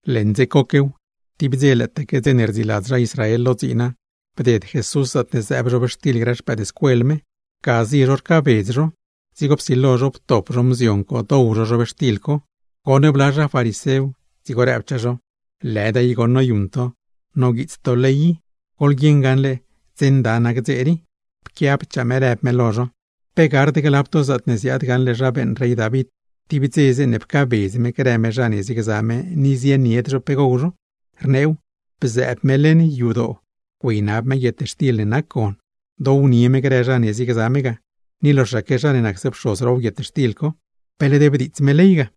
Leṉ dze coquew, tib dze lëëtaque dze ne rdziiladz zha Israel lo dziina, bded Jesús zaatne zëëb zhobxtil grë xpëëdscuel me. Ga zie zho rcaabedz zho, dzigo psilo zho ptop zho mzion co dow zho zhobxtil co. Goṉ bla zha farisew, dzigo rëb zho: ―¡Lëda i goṉ noyuṉ to, noguiits to ley i! Goḻguieṉ gaṉle dze nda nac dze rii. Pquiabchaa me rëb me lo zho: ―¿Pe gard glab to zaatne ziaad gaṉle zha beeṉ rey David, tib dze zeeṉe pcaabedz me grë me zha ne ziegza me, ni zienied zho pe gow zho? Rneew, bzëëb me leṉ yadoo güeynab me guietxtil ne nac gon, downie me grë zha ne ziegza me ga, ni loxaque zha ne nacse pxoz row guietxtil co, ¿pe led bdiitsd me ley ga?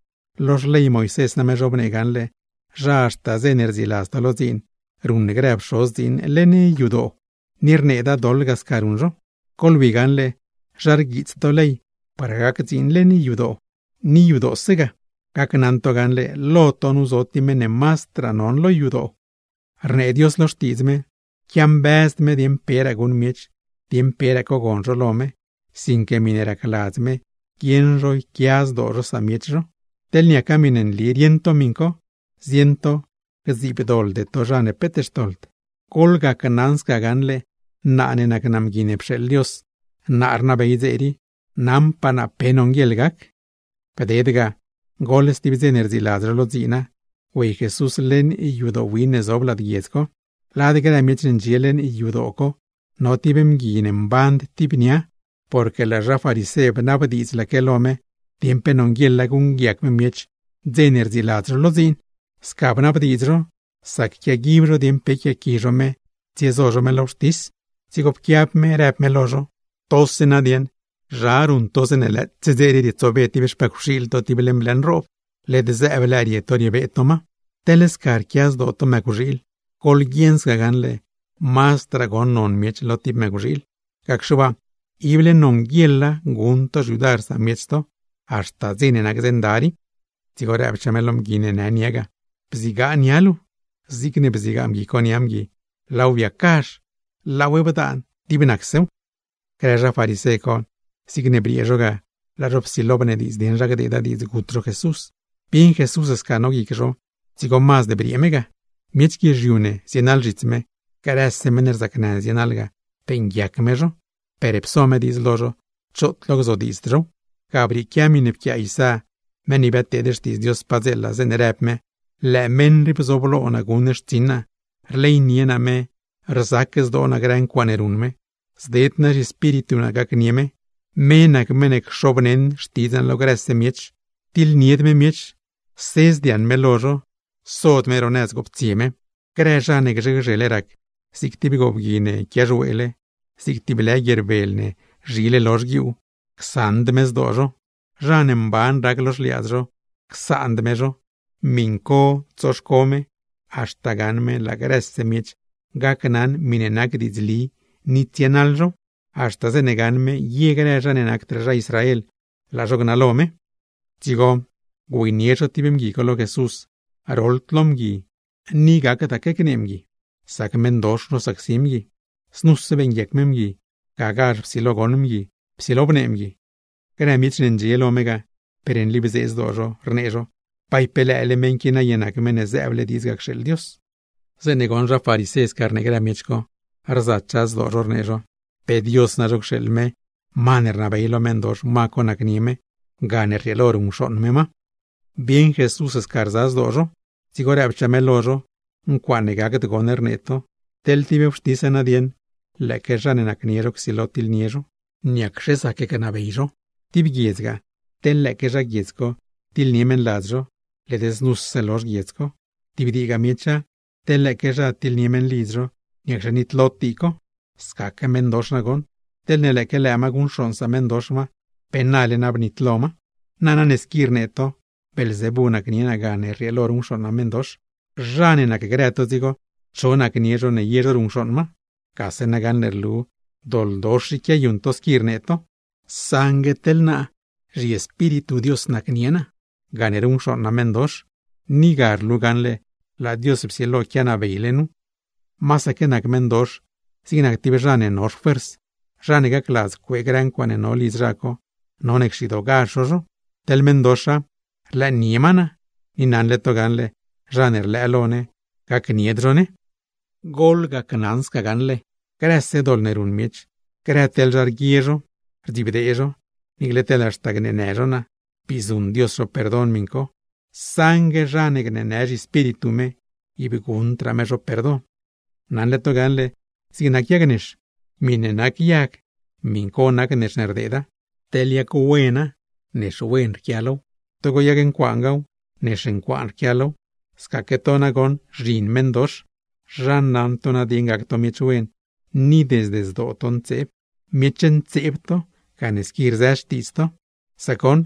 Lo xley Moisés name zhobnee gaṉle zha haxta dze ne rdziiladz to lo dziin ruṉ grë pxoz dziin leṉ yadoo, ni rneeda doḻ ga sca ruṉ zho. Goḻwi gaṉle zha rats ley par gac dziin leṉ yadoo, ni yadoose ga, gacnaṉ to gaṉle lo to nu zo meṉ ne mazdraa non lo yadoo. ’Rnee Dios lo Xtiidz me, quiambëzd me dieṉ peraa guṉ miech, dieṉ peraa cogon zho lo me, sinque miṉe racladz me guieṉ zho yquia zdoo zho samiech zho. Teḻ niaca miṉe nli rieṉ to miṉ co, zieṉ to gdziibdoḻde to zha ne rapd doḻ. Gacnaṉ to gaṉle naa ne nac naa Mgui ne pxeeḻ Dios, naa rnabey dze rii, naṉpaa naa pe nonguieḻ gac. Bded ga, goḻ stib dze ne rdziiladz zho lo dziina, güey Jesús leṉ yadoo win ne zob lad guiedz co. Lad grë miech ne ndxie leṉ yadoo co, no tib mgui ne mband tib nia; porque laa zha farisé bnabdiidzlaque lo me dieṉ pe nonguieḻa guṉguiac me miech dze ne rdziiladz zho lo dziin. Sca bnabdiidz zho, sac quiaguib zho dieṉ pe yquiaaqui zho me tsiezo zho me lo wxtis. Dzigo pquiab me rëb me lo zho: ―Togase dieṉ, zha ruṉ to zeeṉe lëëtse dze rii rietsobe tib xpëcwxiil to tib leṉ blë nroob, ¿led zëëb lëë rie to riebee to ma? Teḻ sca rquia zdoo to mëcwxiil, ¡goḻguieṉ gaṉle mazdraa goṉ non miech lo tib mëcwxiil! Gacxe waa ible nonguieḻa guṉ ne xyudar samiech ne, niicle maase dze nda nac dze co. Dzigo rëbchaa me lo mgui ne në nia ga: ―¡Bzigaa nia luu! Zigne bzigaa mgui nia mgui, biacgazha, biaaṉa zig nac stib miṉe ndaantaque ga. Grë zha farisé co, zigne briee zho ga laa zho psilo bnediidz dieṉ zha gdeeda diidz gut zho Jesús. Bieṉ Jesús sca no guic zho, dzigo mazd briee me ga. Miech guizhiu ne zienaḻ zhits me, grëse meṉ rzacnë ne zienaḻ ga, beeṉguiac me zho; per pso me diidz lo zho, choot lo gzodiidzd zhow. Ga brieequia miṉe pquiaa Isá, tib meṉ ne biadteed xtiidz Dios padzeela, zeeṉe rëb me: Lëë meṉ rii bzooblo naa guṉ xtsiṉ naa, rleynie naa me, rzac zdoo naa grë ncuaaṉe ruṉ me. Zded naa zhiEspíritu naa gacnie me, me nac meṉ ne cxobneṉ xtidz naa lo grëse miech. Tiḻnied me miech, sedzd yaṉ me lo zho, sod me ro nëz goptsie me. Grë zha ne gzhe gzhele rac, zig tib goobgui ne quiaxweele, zig tib lë guier ne noyiidiele, csaṉd me zdoo zho; zha ne mban rac lo xliaadz zho, csaand me zho. Miṉ co tsoxco me, haxta gaṉ me grëse miech gacnaṉ miṉe nac diidzli, ni tsienaḻ zhow. Haxta zeeṉe gaṉ me ye grë zha ne nacdraa zha Israel, laa zho gnalo me. Dzigo güeynie zho tib mgui lo Jesús roḻd lo mgui ni gacdaque gnee mgui, sac nosacsi meṉdox mgui. Znuse beeṉguiac me mgui, gagazh psilo goṉ mgui, psilo bnee mgui. Grë miech ne ndxie lo me ga, per nli bzee zdoo zho, rnee zho: ―¡Bay pe lëë meṉ qui naye nac Meṉ ne zëëble diidz ga cxeeḻ Dios! Zeeṉe goṉ zha farisé sca rnee grë miech co, rzachaa zdoo zho rnee zho: “Pe Dios nazho cxeeḻ me, ma ne rnabey lo meṉdox ma co nacnie me, gane rrieelo ruṉcxooṉ me meṉdox.” Bieṉ Jesús sca rza guic zho, dzigo rëbchaa me lo zho: ―¡Ncuaaṉe gacd goṉ rnee to! Teḻ tib wxtis nadieṉ lëëque zha ne nacnie zho csilo tiḻnie zho, ¿niacxe zac gnabey zho? Tib guiedza, teḻ lëëque zha guiedz co tiḻnie meṉladz zho, led znuse lozh guiedz co; tib diigaa miecha, teḻ lëëque zha tiḻnie meṉlidz zho, ¿niacxe nitlod dii co? Scaque meṉdox nagoṉ, teḻne lëëque lëë ma guṉcxooṉ sameṉdox ma, ¡pe nale na bnitlo ma! Nana ne squi rnee to Beelzebú nacnie naa gane rrieelo ruṉcxooṉ naa meṉdox, ¿zha ne nacgrë to dzigo, cho nacnie zho ne ye zho ruṉcxooṉ ma? Gase nagaṉle rlu doḻdox i quiayuṉ to, squi rnee to. Saṉgue teḻ naa zhiEspíritu Dios nacnie naa gane ruṉcxooṉ naa meṉdox, ni ga rlu gaṉle laa Dios psilo quianabeyle nu. ’¡Masaque nac meṉdox zig tib zha ne no xfuers, zha ne gacladz cuee grë ncuaaṉe no lidz zha co, none cxidoogazh zho zho! Teḻ meṉdoxa rlëënie ma naa, ni naṉle to gaṉle zha ne rlëë lo ne, gacnied zho ne. ’Gacnaṉ to gaṉle, grëse doḻ ne ruṉ miech, grë teḻ zha rguie zho, rdzibdee zho, niicle teḻ haxta gneenë zho naa, bii zuṉ Dios zho perdon miṉ co; saṉgue zha ne gneenë zhiEspíritu me, ib guṉdraa me zho perdon. ’Naṉle to gaṉle zig nac yag nex, miṉe nac yag, miṉ co nac nex ne rdeeda. Teḻ yag wena nex wen rquia low, togo yag ncuaangaaw, nex ncuaanaque rquia low. ¡Scaque to nagoṉ zhin meṉdox! ¿Zha naṉ to nadieṉ gac to miech wen, teḻ desde zdoo to ntseeb? Miech ntseeb to gane squi rzë xtiidz to, sac goṉ,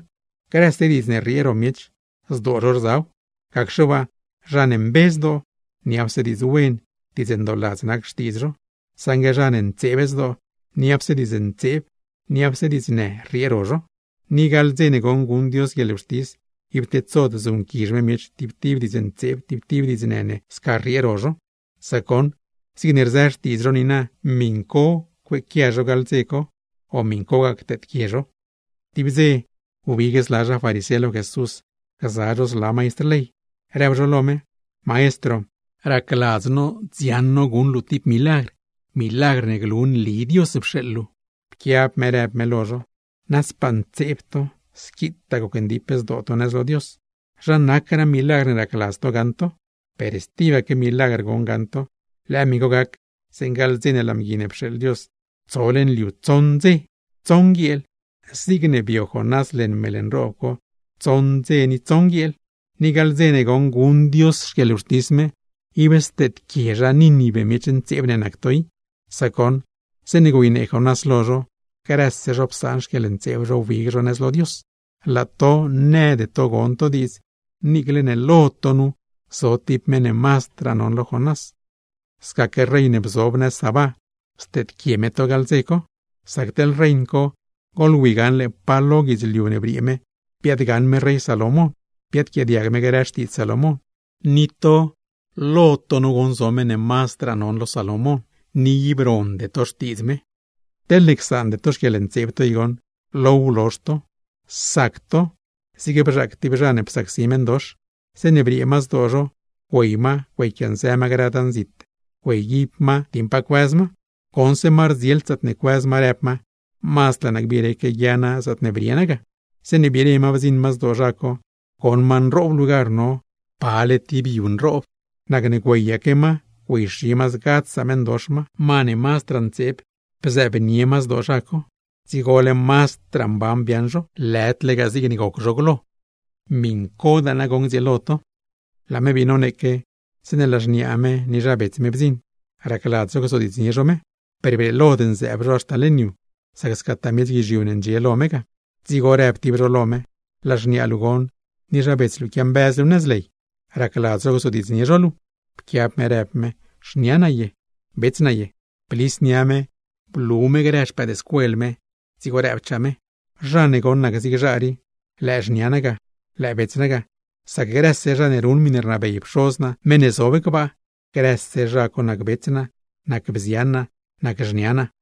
¡grëse diidz ne rriee ro miech, zdoo zho rzaw! Gacxe waa, zha ne mbe zdoo, niapse diidz wen, diidz ndooladz nac xtiidz zho. Saṉgue zha ne ntseeb zdoo, niapse diidz ntseeb, niapse diidznë rrieeche ro zho. Ni gaḻ dze ne goṉ guṉ Dios guieḻwxtis, ib tedsod zuṉquizh me miech tib tib diidz ntseeb, tib tib diidznë ne sca rriee ro zho. Sac goṉ zigne rzë xtiidz zho niina, miṉ co cueequia zho gaḻ dze co, o miṉcogaa cteedquie zho. Tib dze wbig zla zha farisé lo Jesús gza zho zla maistr ley, rëb zho lo me: ―Maestro, racladz no dziaṉ no guṉ luu tib milagr, milagr ne glu nli Dios pxeeḻ luu. Pquiab me rëb me lo zho: ―Nazdpaa ntseeb to, squitaa gocndip zdoo to nëz lo Dios, ¿zha nacraa milagr ne racladz to gaṉ to? Stibaque milagr goṉ gaṉ to, lëë miṉ co gac zeeṉ gaḻ dze ne laa Mgui ne pxeeḻ Dios, tso leṉ liu tsoṉ dze, tsoṉ guieel zigne bio Jonás leṉ meḻ nroob co tsoṉ dze ni tsoṉ guieel. Ni gaḻ dze ne goṉ guṉ Dios xquieḻwxtis me, ib steedquie zha Nínive miech ntseeb ne nac to i; sac goṉ zeeṉe güeynee Jonás lo zho, grëse zho psaan xquieḻntseeb zho wbig zho nëz lo Dios, laa to nëde to gon to diidz niicle ne lo to nu zo tib meṉ ne mazdraa non lo Jonás. Scaque rein ne bzob nëz Sabá, steedquie me to gaḻ dze co, sac teḻ rein co goḻwi gaṉle pa lo guidzliu ne briee me biaadgaṉ me rey Salomón, biadquiaadiag me grë xtiidz Salomón. Ni to lo to nu zo meṉ ne mazdraa non lo Salomón, ni ib ronde to xtiidz me. ’Teḻne csaande to xquieḻntseeb to i goṉ, low lozh to. Sac to zig bzhaac tib zha ne psacsi meṉdox. Zeeṉe briee ma zdoo zho, güey ma güeyquianzë ma grë dan zit güeyguib ma dieṉ pa cuëz ma. Goṉse ma rdzield zaatne cuëz ma, rëb ma: “Mazd laa naa gbireque guia naa zaatne brie naa ga.” Zeeṉe biire ma bdziṉ ma zdoo zha co, goṉ ma nroob lugar no, pale tib yu dets, nacne güeyaque ma güeyxi ma zgadz sameṉdox ma, ma ne mazdraa ntseeb blëznie ma zdoo zha co. ¡Dzigole mazdraa mban biaaṉ zha co, lëdlegaa zigne goc zho glo! Scadaa nagoṉ gdzieelo to. Laa me bii noneeque, zeeṉe laa xniaa me ni zha bets me bdziṉ, racladz zho gzodiidznie zho me. Per brieelod nzëëb zho haxta leṉ yu, sac scataa miech guizhiu ne ndxie lo me ga. Dzigo rëb tib zho lo me: ―Laa xniaa luu goṉ ni zha bets luu quiambëz luu nëz ley, racladz zho gzodiidznie zho luu. Pquiab me rëb me: ―¿Xnia naa ye, bets naa ye? Blis nia me, blu me grë xpëëdscuel me, dzigo rëbchaa me: ―Zha ne goṉ nac zig zha rii, lëë xnia naa ga, lëë bets naa ga. ¡Sac grëse zha ne ruṉ miṉe rnabey Pxoz naa meṉ ne zob gbaa, grëse zha co nac bets naa, nac bzian naa, nac xnia naa!